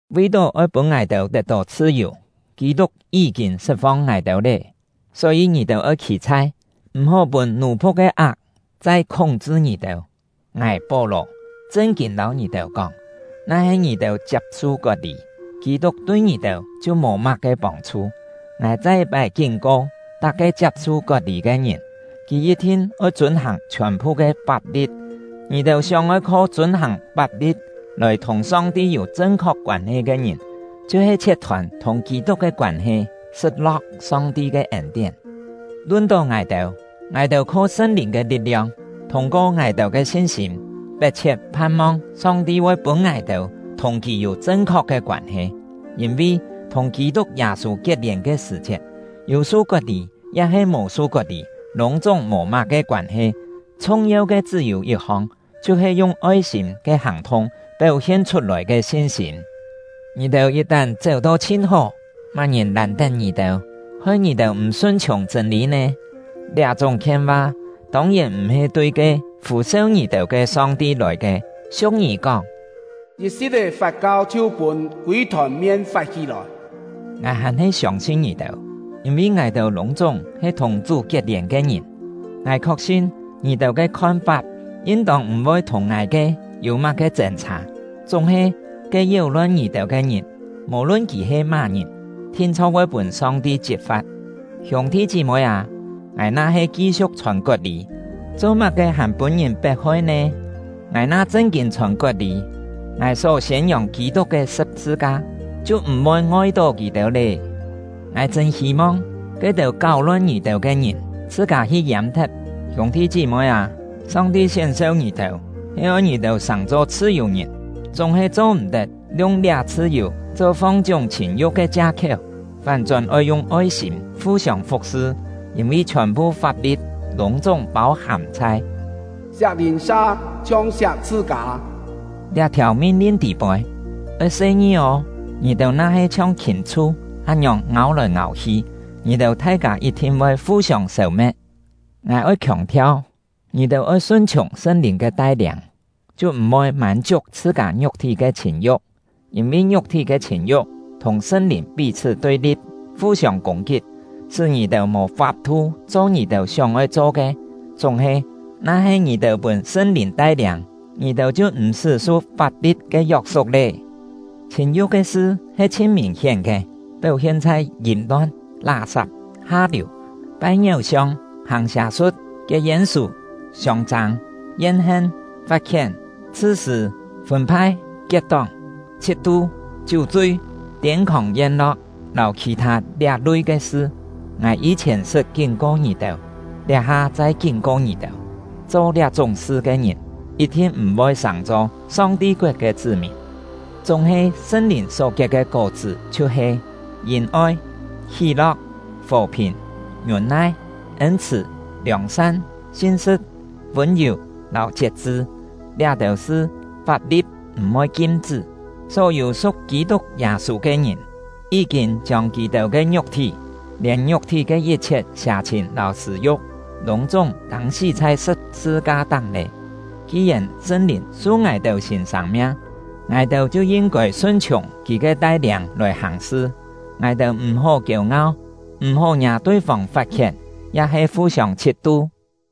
Vi-tó oi pûn ngài-têu tet-tó chhṳ-yù, Kî-tuk yí-kîn sṳt-fong ngài-têu lé. Só-yî, ngì-têu oi khî-chhai, m̀-hó pûn nù-li ke ak chai khúng-chṳ ngì-têu! Ngài — Pó-lò chṳn-kîn lâu ngì-têu kóng, na-he ngì-têu chiap-su kot-lî, Kî-tuk tui ngì-têu chhiu mò má-ke pông-chhu. Ngài chai yit-pái kín-ko tak-ke chiap-su kot-lî ke ngìn, kì yit-thin oi chûn-hàng chhiòn-phu ke fap-li̍t! Ngì-têu sióng-oi kho chûn-hàng fap-li̍t lòi thùng Song-ti yû chṳn-khok koân-he ke ngìn, chhiu-he chhiet-thôn thùng Kî-tuk ke koân-he, sṳt-lo̍k Song-ti ke ên-tién. Lun-tó ngài-têu, ngài-têu kho Sṳn-Lìn ke li̍t-liong, thûng-ko ngài-têu ke sin-sîm, pet-chhiet phan-mong Song-ti voi pûn ngài-têu thùng Kì yû chṳn-khok ke koân-he. Yîn-vi, thùng Kî-tuk Yâ-sû kiet-lièn ke sṳ̀-chiet, yû su kot-lî ya-he mò su kot-lî lûng-chúng mò má-ke koân-he; chhung-yeu ke chṳ́-yû yit-hong, chhiu-he yung oi-sîm ke hàng-thung péu-hien chhut-lòi ke sin-sîm. Ngì-têu yit-tán chéu-to chhin hó! Má-ngìn làn-tén ngì-têu, hoi ngì-têu m̀ sun-chhiùng chṳ̂n-lî nè? Liá-chúng khien-va tông-yèn m̀-he tui ke fû-seu ngì-têu ke Song-ti lòi ke. Siu̍k-ngî kóng: “Yit-si̍t-é fat-kau chhiu pûn kûi-thòn mien fat-hí-lòi.” Ngài hàn-he siông-sin ngì-têu; yîn-vi ngài-têu lûng-chúng he thùng Chú kiet-lièn ke ngìn, ngài khok-sin ngì-têu ke khon-fap yin-tông m̀-voi thùng ngài ke yû má-ke chên-chhâ. Chúng-he, ke yéu-lon ngì-têu ke ngìn, mò-lun kì he má-ngìn, thin-chho̍k voi pûn Song-ti chit-fa̍t! Hiûng-thi chí-moi â, ngài na-he ki-siu̍k chhòn kot-lî, cho-má-ke hàn pûn-ngìn pet-hoi nè? Ngài na chṳn-kîn chhòn kot-lî, ngài só siên-yòng Kî-tuk ke sṳ̍p-sṳ-ka chhiu m̀-voi ngoi-tó kì-têu lé! Ngài chṳ̂n hî-mong ke-têu káu-lon ngì-têu ke ngìn chhṳ-kâ hi yâm-thet! Hiûng-thi chí-moi â, Song-ti sién-seu ngì-têu, he oi ngì-têu sàng-cho chhṳ-yù-ngìn. Chúng-he cho-m̀-tet yung liá chhṳ-yù cho fong-chiúng chhìn-yu̍k ke chia-khiéu, fán-chón oi yung oi-sîm fu-siông fu̍k-sṳ. Yîn-vi chhiòn-phu fap-li̍t lûng-chúng pâu-hàm chhai “siak lìn-sa chhiong siak chhṳ-kâ” liá-thiàu min-lin tî-poi. Oi se-ngi ô! Ngì-têu na-he chhiong khìm-chhu án-ngiòng ngâu-lòi ngâu-hi, ngì-têu thai-kâ yit-thin voi fu-siông sêu-me̍t! Ngài oi khiòng-thiau: Ngì-têu oi sun-chhiùng Sṳn-Lìn ke tai-liâng, chhiu m̀ voi mân-chiuk chhṳ-kâ ngiuk-thí ke chhìn-yu̍k. Yîn-vi ngiuk-thí ke chhìn-yu̍k thùng Sṳn-Lìn pí-chhṳ́ tui-li̍p, fu-siông kûng-kit, sṳ́ ngì-têu mò fap-thu cho ngì-têu sióng-oi cho ke. Chúng-he, na-he ngì-têu pûn Sṳn-Lìn tai-liâng, ngì-têu chhiu m̀-sṳ́ su fap-li̍t ke yok-suk lé. Chhìn-yu̍k ke sṳ he chhin mìn-hién ke, péu-hien chhai yìm-lon, lá-sap, ha-liù, pai ngiéu-siong, hàng sià-su̍t, kiet yên-sù, siông-châng, yen-hen, fat-khién, chhṳ-sṳ̂, fûn-phai, kiet-tóng, chhit-tu, chiú-chui, tiên-khòng yen-lo̍k, lâu khì-thâ liá-lui ke sṳ. Ngài yî-chhièn sṳt kín-ko ngì-têu, liá-ha chai kín-ko ngì-têu: Cho liá-chúng sṳ ke ngìn, yit-thin m̀-voi sàng-cho Song-ti koet ke chṳ́-mìn! Chúng-he Sṳn-Lìn só kiet ke kó-chṳ́ chhiu-he: Yìn-oi, hí-lo̍k, fò-phìn, ngiûn-nai, ên-chhṳ̀, liòng-san, sin-sṳ̍t, vûn-yù, lâu chiet-chṳ. Liá-têu sṳ fap-li̍t m̀-voi kim-chṳ́. Só-yû su̍k Kî-tuk Yâ-sû ke ngìn, yí-kîn chiông kì-têu ke ngiuk-thí, lièn ngiuk-thí ke yit-chhiet sià-chhìn lâu sṳ̂-yu̍k, lûng-chúng tâng-sí chhai sṳ̍p-sṳ-ka-táng lé. Ki-yèn Sṳn-Lìn su ngài-têu sîn sâng-miang, ngài-têu chhiu yin-kôi sun-chhiùng Kì ke tai-liâng lòi hàng-sṳ. Ngài-têu m̀-hó kiêu-ngau, m̀-hó ngiâ tui-fông fat-khién, ya-he fu-siông chhit-tu.